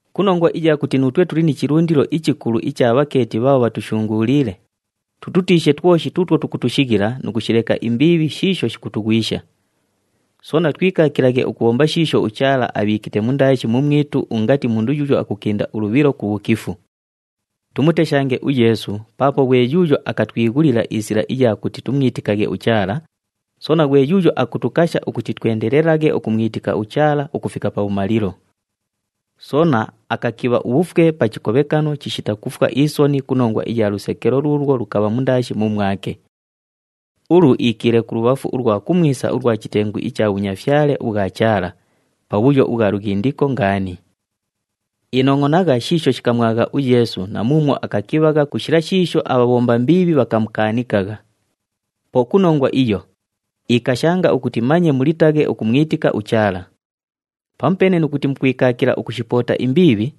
Ku nongwa iya kuti nuutwe tuli ni chilundilo ichikulu icha bhakeeti bhaabho bhatushunguuliile, tututiishe twoshi tuutwo tukutushighila nu kushileka imbiibhi shiisho shikutughwisha. Soona twikaakilaghe ukubhomba shiisho uChaala abhiikite mundaashi mumwitu ungati mundu yuuyo akukinda ulubhilo ku bhukifu. Tumuteshange uYeesu paapo ghwe yuuyo akatwighulila isila iya kuti tumwitikaghe uChaala, soona ghwe yuuyo akutukasha ukuti twendelelaghe ukumwitika uChaala ukufika pabhumalilo. Soona akakibha ubhufwe pa chikobhekano chishita kufwa isoni ku nongwa iya lusekelo luulwo lukabha mundaashi mumwake. Ulu iikiile kulubhafu ulwa kumwisa ulwa chitengu icha bhunyafyale ubhwa Chaala, pabhuyo ubhwa lughindiko ngaani. Inongʼonagha shiisho shikamwagha uYeesu na muumwo akakibhagha ku shila shiisho abhabhomba mbiibhi bhakamukaanikagha. Po ku nongwa iyo, ikashanga ukuti manye mulitaghe ukumwitika uChaala. Pamupeene nu kuti mukwikaakila ukushipoota imbiibhi,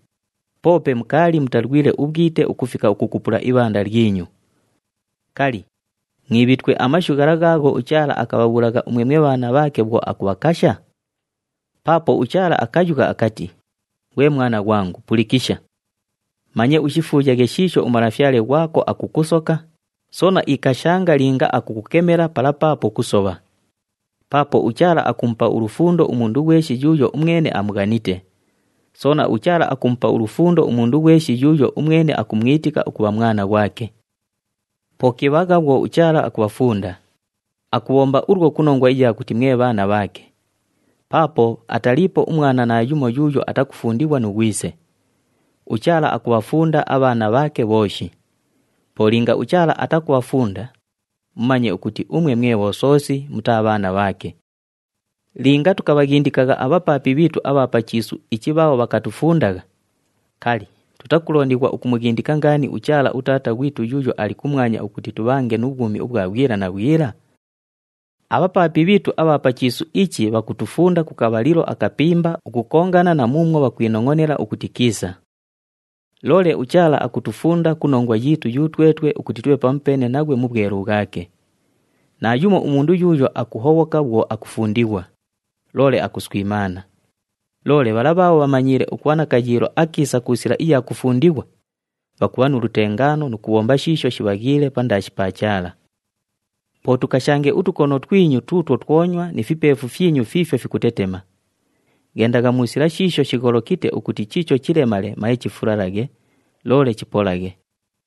poope mukaali mutalwile ubhwite ukufika ukukupula ibhanda lyinyu. Kali, mwibhitwe amashu ghala ghaagho uChaala akabhabhuulagha umwe mwe bhaana bhaake bhwo akubhakasha? Paapo uChaala akayugha akati, “Ghwe mwana ghwangu, pulikisha! Manye ushifuuyaghe shiisho uMalafyale ghwako akukusoka, soona ikashanga linga akukukemela pala paapo kusobha. Paapo uChaala akumupa ulufundo umundu ghweshi yuuyo umwene amughanite. Soona, uChaala akumupa ulufundo umundu ghweshi yuuyo umwene akumwitika ukubha mwana ghwake.” Po kibhagha bhwo uChaala akubhafunda. Akubhomba ulwo ku nongwa iya kuti mwe bhaana bhaake. Paapo ataliipo umwana naayumo yuuyo atakufundighwa nu ghwise. UChaala akubhafunda abhaana bhaake bhooshi. Po linga uChaala atakubhafunda, mumanye ukuti umwe mwe bhosoosi, mutaa bhaana bhaake. Linga tukabhaghindikagha abhapaapi bhiitu abha pa chiisu ichi bhaabho bhakatufundagha, kali, tutakulondighwa ukumughindika ngaani uChaala uTaata ghwitu yuuyo ali kumwanya ukuti tubhange nu bhwumi ubhwa bhwila na bhwila? Abhapaapi bhiitu abha pa chiisu ichi bhakutufunda ku kabhalilo akapimba ukukongana na muumwo bhakwinongʼonela ukuti kiisa. Loole uChaala akutufunda ku nongwa yiitu yutwetwe ukuti tubhe pamupeene naghwe mu bhwelu bhwake. Naayumo umundu yuuyo akuhobhoka bhwo akufundighwa, loole akuswimaana. Loole bhala bhaabho bhamanyiile ukubha na kayiilo akiisa ku sila iya kufundighwa, bhakubha nu lutengaano nu kubhomba shiisho shibhaghiile pandaashi pa Chaala. Po tukashange utukono twinyu tuutwo twonywa ni fipeefu fyinyu fiifyo fikutetema. Ghendagha mu sila shiisho shigholokite ukuti chiicho chilemale manye chifulalaghe, loole chipolaghe.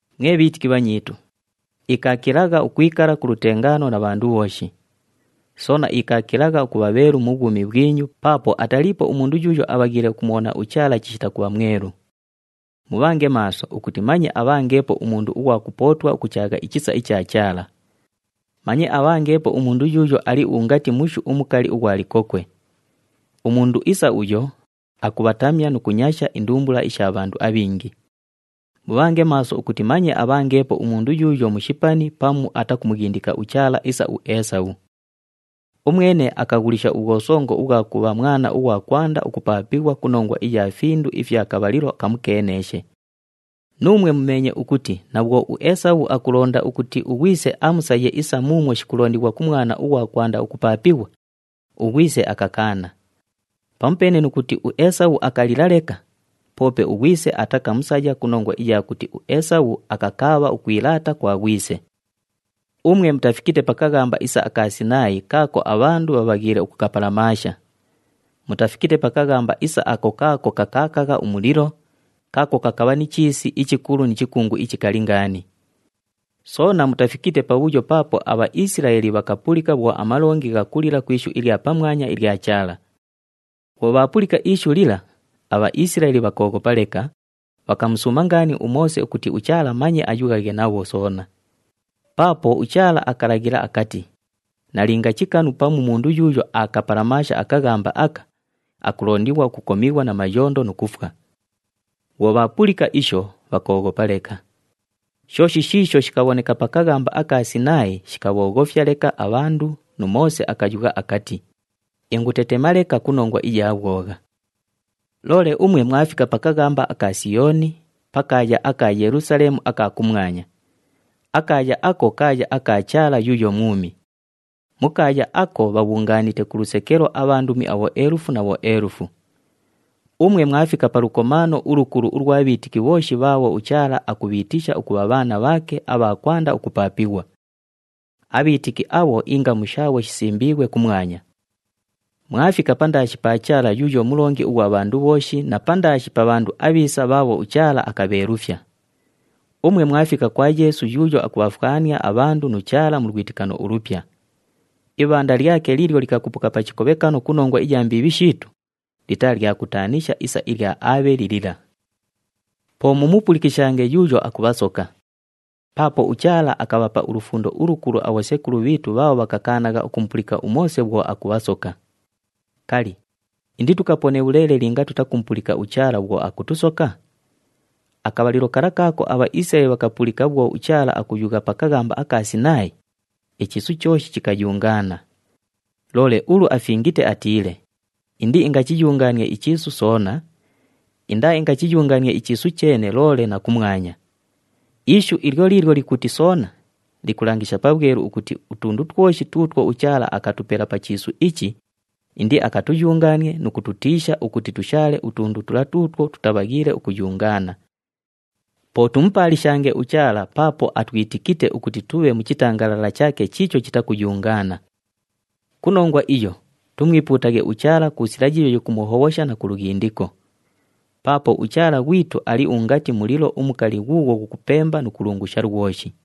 Mwe bhiitiki bhanyiitu, ikaakilagha ukwikala ku lutengaano na bhandu bhooshi. Soona ikaakilagha ukubha bheelu mu bhwumi bhwinyu paapo ataliipo umundu yuuyo abhaghiile ukumubhona uChaala chishita kubha mwelu. Mubhange maaso ukuti manye abhangeepo umundu ughwa kupootwa ukuchaagha ichisa icha Chaala. Manye abhangeepo umundu yuuyo ali ungati mushu umukali ughwa likokwe. Umundu isa uyo, akubhatamya nu kunyasha indumbula isha bhandu abhingi. Mubhange maaso ukuti manye abhangeepo umundu yuuyo mushipani pamu atakumughindika uChaala isa uEesabhu. Umwene akaghulisha ubhwosongo ubhwa kubha mwana ughwa kwanda ukupaapighwa ku nongwa iya findu ifya kabhalilo kamukeeneeshe. Nuumwe mumeenye ukuti na bhwo uEesabhu akulonda ukuti ughwise amusaye isa muumwo shikulondighwa ku mwana ughwa kwanda ukupaapighwa, ughwise akakaana. Pamupeene nu kuti uEesabhu akalila leka, poope ughwise atakamusaya ku nongwa iya kuti uEesabhu akakaabha ukwilaata kwa ghwise. Umwe mutafikite pa kaghamba isa aka Sinaayi kaako abhandu bhabhaghiile ukukapalamaasha. Mutafikite pa kaghamba isa ako kaako kakaakagha umulilo, kaako kakabha ni chiisi ichikulu ni chikungu ichikali ngaani. Soona mutafikite pabhuyo paapo aBhaisilaeli bhakapulika bhwo amalongi ghakulila ku ishu ilya pamwanya ilya Chaala. Bhwo bhaapulika ishu lila, aBhaisilaeli bhakooghopa leka, bhakamusuuma ngaani uMoose ukuti uChaala manye ayughaghe nabho soona. Paapo uChaala akalaghila akati, “Nalinga chikanu pamu mundu yuuyo aakapalamaasha akaghamba aka, akulondighwa ukukomighwa na mayondo nu kufwa.” Bhwo bhaapulika isho, bhakooghopa leka. Shooshi shiisho shikabhoneka pa kaghamba aka Sinaayi shikabhooghofya leka abhandu nu Moose akayugha akati, “Ingutetema leka ku nongwa iya bhwogha.” Loole umwe mwafika pa kaghamba aka Siyooni, pa kaaya aka Yelusaleemu aka kumwanya. Akaaya ako kaaya aka Chaala yuuyo mwumi. Mu kaaya ako bhabhungaanite ku lusekelo abhandumi abhoelufu na bhoelufu. Umwe mwafika pa lukomaano ulukulu ulwa bhiitiki bhooshi bhaabho uChaala akubhiitisha ukubha bhaana bhaake abha kwanda ukupaapighwa. Abhiitiki abho ingamu shaabho shisimbiighwe kumwanya. Mwafika pandaashi pa Chaala yuuyo Mulongi ughwa bhandu bhooshi na pandaashi pa bhandu abhiisa bhaabho uChaala akabheelufya. Umwe mwafika kwa Yeesu yuuyo akubhafwania abhandu nu Chaala mu lwitikano ulupya. Ibhanda lyake liilyo likakupuka pa chikobhekano ku nongwa iya mbiibhi shiitu, litaa lya kutaanisha isa ilya Aabheli lila. Po mumupulikishange yuuyo akubhasoka. Paapo uChaala akabhapa ulufundo ulukulu abhosekulu bhiitu bhaabho bhakakaanagha ukumupulika uMoose bhwo akubhasoka. Kali, inditukapone bhuleele linga tutakumupulika uChaala bhwo akutusoka? Akabhalilo kala kaako aBhaisilaeli bhakapulika bhwo uChaala akuyugha pa kaghamba aka Sinaayi, ichiisu chooshi chikayungaana. Loole ulu afingite atiile, “Indiingachiyungaanie ichiisu soona, indaaingachiyungaanie ichiisu cheene loole na kumwanya.” Ishu ilyo liilyo likuti, “Soona” likulangisha pabhwelu ukuti utundu twoshi tuutwo uChaala akatupela pa chiisu ichi, indiakatuyungaanie nu kututiisha ukuti tushaale utundu tula tuutwo tutabhaghiile ukuyungaana. Po tumupaalishange uChaala paapo atwitikite ukuti tubhe mu chitangalala chaake chiicho chitakuyungaana. Ku nongwa iyo tumwipuutaghe uChaala ku sila yiiyo yikumuhobhosha na ku lughindiko. Paapo uChaala ghwitu ali ungati mulilo umukali ghuughwo ghukupemba nu kulungusha lwoshi.